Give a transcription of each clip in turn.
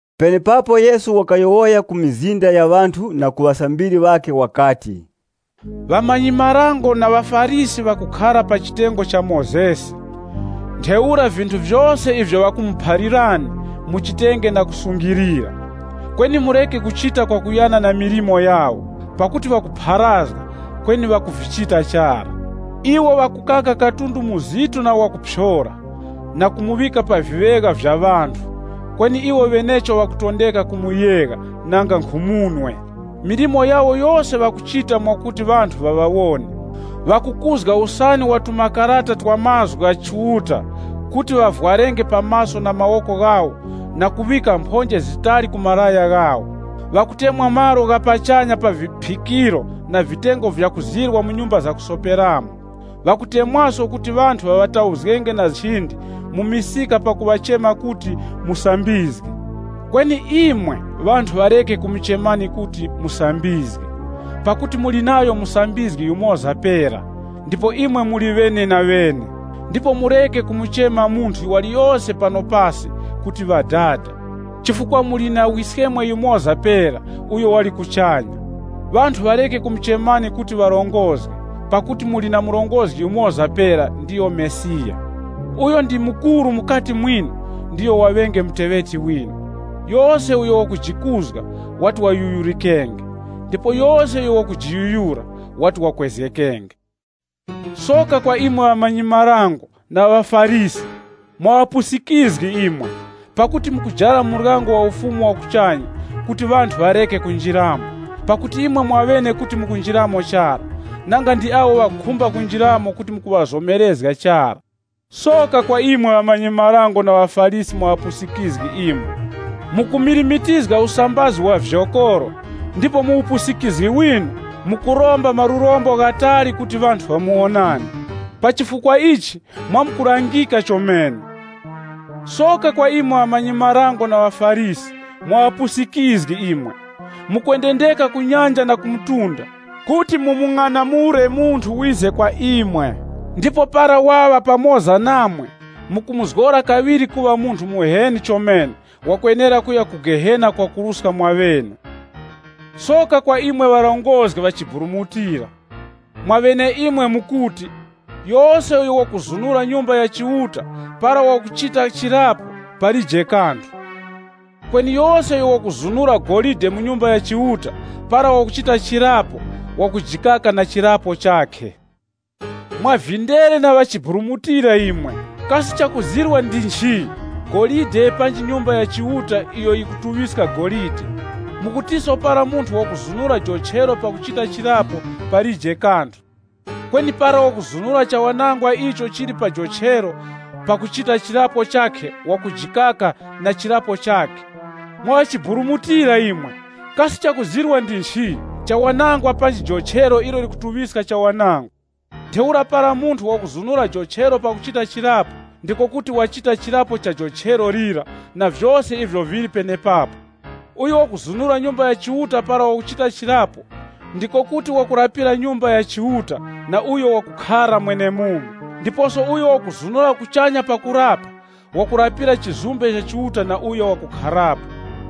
Penepapo Yesu wakayowoya ku mizinda ya ŵanthu na ku ŵasambiri ŵakhe wakati, “Ŵamanyi-marango na ŵaFarisi ŵakukhara pa chitengo cha Mozesi, ntheura vinthu vyose ivyo ŵakumuphalirani, muchitenge na kusungilira. Kweni mureke kuchita kwakuyana na milimo yawo, pakuti ŵakupharazga, kweni ŵakuvichita chara. Iwo ŵakukaka katundu muzitu na wakuphyora na kumuŵika pa viŵegha vya ŵanthu, kweni iwo ŵenecho ŵakutondeka kumuyegha nanga nkhu munwe. Milimo yawo yose ŵakuchita mwakuti ŵanthu ŵaŵawone. Ŵakukuzga usani wa tumakarata twa mazgu gha Chiuta kuti ŵavwarenge pa maso na mawoko ghawo na kuŵika mphonje zitali ku malaya ghawo. Ŵakutemwa malo gha pachanya pa viphikiro na vitengo vya kuzirwa mu nyumba zakusoperamo. Ŵakutemwaso kuti ŵanthu ŵaŵatauzgenge na nchindi mu misika pakuŵachema kuti, ‘Musambizgi.’ Kweni imwe ŵanthu ŵareke kumuchemani kuti, ‘Musambizgi,’ pakuti muli nayo musambizgi yumoza pera, ndipo imwe muli ŵenenaŵene. Ndipo mureke kumuchema munthu waliyose pano pasi kuti ‘Ŵadada,’ chifukwa muli na Wiskemwe yumoza pera uyo wali kuchanya. Ŵanthu ŵareke kumuchemani kuti ŵarongozgi, pakuti muli na murongozgi yumoza pera, ndiyo Mesiya. Uyo ndi mukuru mukati mwinu, ndiyo waŵenge muteŵeti winu. Yose uyo wakujikuzga, wati wayuyurikenge. Ndipo yose uyo wakujiyuyura, wati wakwezgekenge. “Soka kwa imwe ŵamanyi-marango na ŵaFarisi! Mwa ŵapusikizgi imwe! Pakuti mukujara muryango wa Ufumu wa kuchanya kuti ŵanthu ŵareke kunjiramo. Pakuti imwe mwaŵene kuti mukunjiramo chara, nanga ndi awo ŵakukhumba kunjiramo kuti mukuŵazomerezga chara! [ Soka kwa imwe ŵamanyi-marango na ŵaFarisi mwa ŵapusikizgi imwe! Mukumirimitizga usambazi wa vyokoro, ndipo mu upusikizgi winu, mukuromba malurombo ghatali kuti ŵanthu ŵamuwonani. Pa chifukwa ichi mwamkulangika chomene.] “Soka kwa imwe ŵamanyi-marango na ŵaFarisi! Mwa ŵapusikizgi imwe! Mukwendendeka ku nyanja na ku mtunda, kuti mumung'anamule munthu wize kwa imwe, ndipo para waŵa pamoza namwe mukumuzgora kaŵiri kuŵa munthu muheni chomene wakwenera kuya ku Gehena kwakuruska mwaŵene. “Soka kwa imwe ŵarongozgi ŵachiburumutira! Mwaŵeneimwe mukuti, ‘Yose uyo wakuzunura Nyumba ya Chiuta para wakuchita chirapo, palije kanthu. Kweni yose uyo wakuzunura golide la Nyumba ya Chiuta para wakuchita chirapo, wakujikaka na chirapo chakhe.’ Mwa vindere vyakuburumutizgika imwe! Kasi chakuzirwa ndi nchi, golide, panji Nyumba ya Chiuta iyo yikutuŵiska golide? Mukutiso para munthu wakuzunura jochero pakuchita chirapo, palije kanthu. Kweni para wakuzunura chawanangwa icho chili pa jochero pakuchita chirapo chakhe, wakujikaka na chirapo chakhe. Mwa ŵachiburumutira imwe! Kasi chakuzirwa ndi nchi, chawanangwa panji jochero ilo likutuŵiska chawanangwa? Ntheura para munthu wakuzunura jochero pakuchita chirapo, ndiko kuti wachita chirapo cha jochero lira na vyose ivyo vili penepapo. Uyo wakuzunura Nyumba ya Chiuta para wakuchita chirapo, ndiko kuti wakurapira Nyumba ya Chiuta na uyo wakukhara mwenemumo. Ndiposo uyo wakuzunura kuchanya pakurapa, wakurapira chizumbe cha Chiuta na uyo wakukharapo.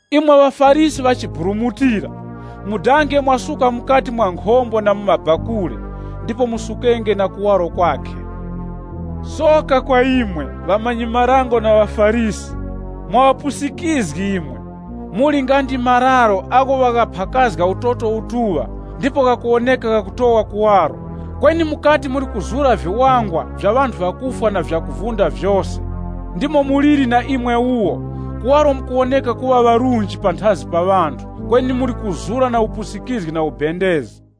Imwe ŵaFarisi ŵachiburumutira! Mudange mwasuka mukati mwa nkhombo na mu bakule, ndipo musukenge na kuwaro kwakhe. “Soka kwa imwe, ŵamanyi-marango na ŵaFarisi! Mwa ŵapusikizgi imwe! Muli nga ndi nkhwichi iyo ŵayiphaka utoto utuŵa ndipo yikuwoneka yakutowa kuwaro, kweni mukati muli kuzura viwangwa vya ŵanthu ŵakufwa na vyakuvunda vyose. Ndimo muliri na imwe wuwo. Kuwaro mukuwoneka kuŵa ŵarunji panthazi pa ŵanthu, kweni muli kuzura na upusikizgi na ubendezi.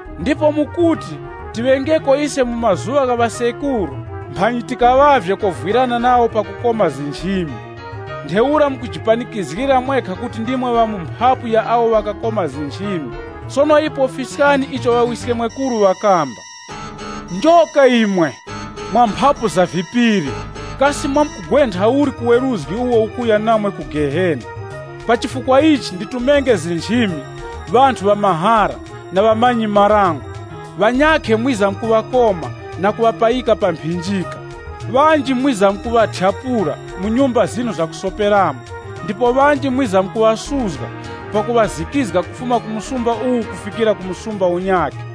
Ndipo mukuti, ‘Tiŵengeko ise mu mazuŵa gha ŵasekuru, mphanyi tikaŵavye kovwirana nawo pakukoma nchimi. Ntheura mukujipanikizgira mwekha kuti ndimwe ŵa mu mphapu ya awo ŵakakoma nchimi. Sono ipo fiskani icho ŵawiskemwekuru ŵakamba.’ Njoka imwe! Mwa mphapu za vipiri! Kasi mwamkugwentha uli ku weruzgi uwo ukuya namwe ku Gehena? Pa chifukwa ichi, nditumenge nchimi, ŵanthu ŵamahara, na ŵamanyi-marango. Ŵanyakhe mwizamkuŵakoma na kuŵapayika pa mphinjika. Ŵanji mwizamkuŵathyapula mu nyumba zinu zakusoperamo, ndipo ŵanji mwizamkuŵasuzga pakuŵazikizga kufuma ku muzi uwu kufikira ku muzi unyakhe.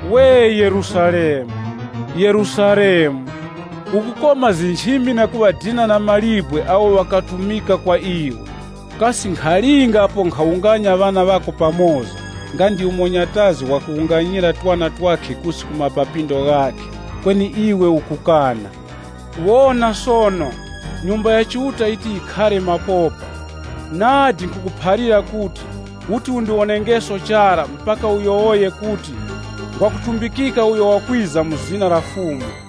“We Yerusalemu, Yerusalemu! Ukukoma nchimi na kuŵadina na mawe awo ŵakatumika kwa iwe! Kasi nkhalinga ako mphanyi nkhawunganya ŵana ŵako pamoza nga ndi umo nyatazi wakuwunganyira twana twakhe kusi ku mapapindo ghakhe, kweni iwe ukukana! Wonani sono, Nyumba ya Chiuta yiti yikhare mapopa. Nadi nkhukuphalira kuti, muti mundiwonengeso chara mpaka muyowoye kuti, ‘Ngwakutumbikika uyo wakwiza mu zina la Fumu.’”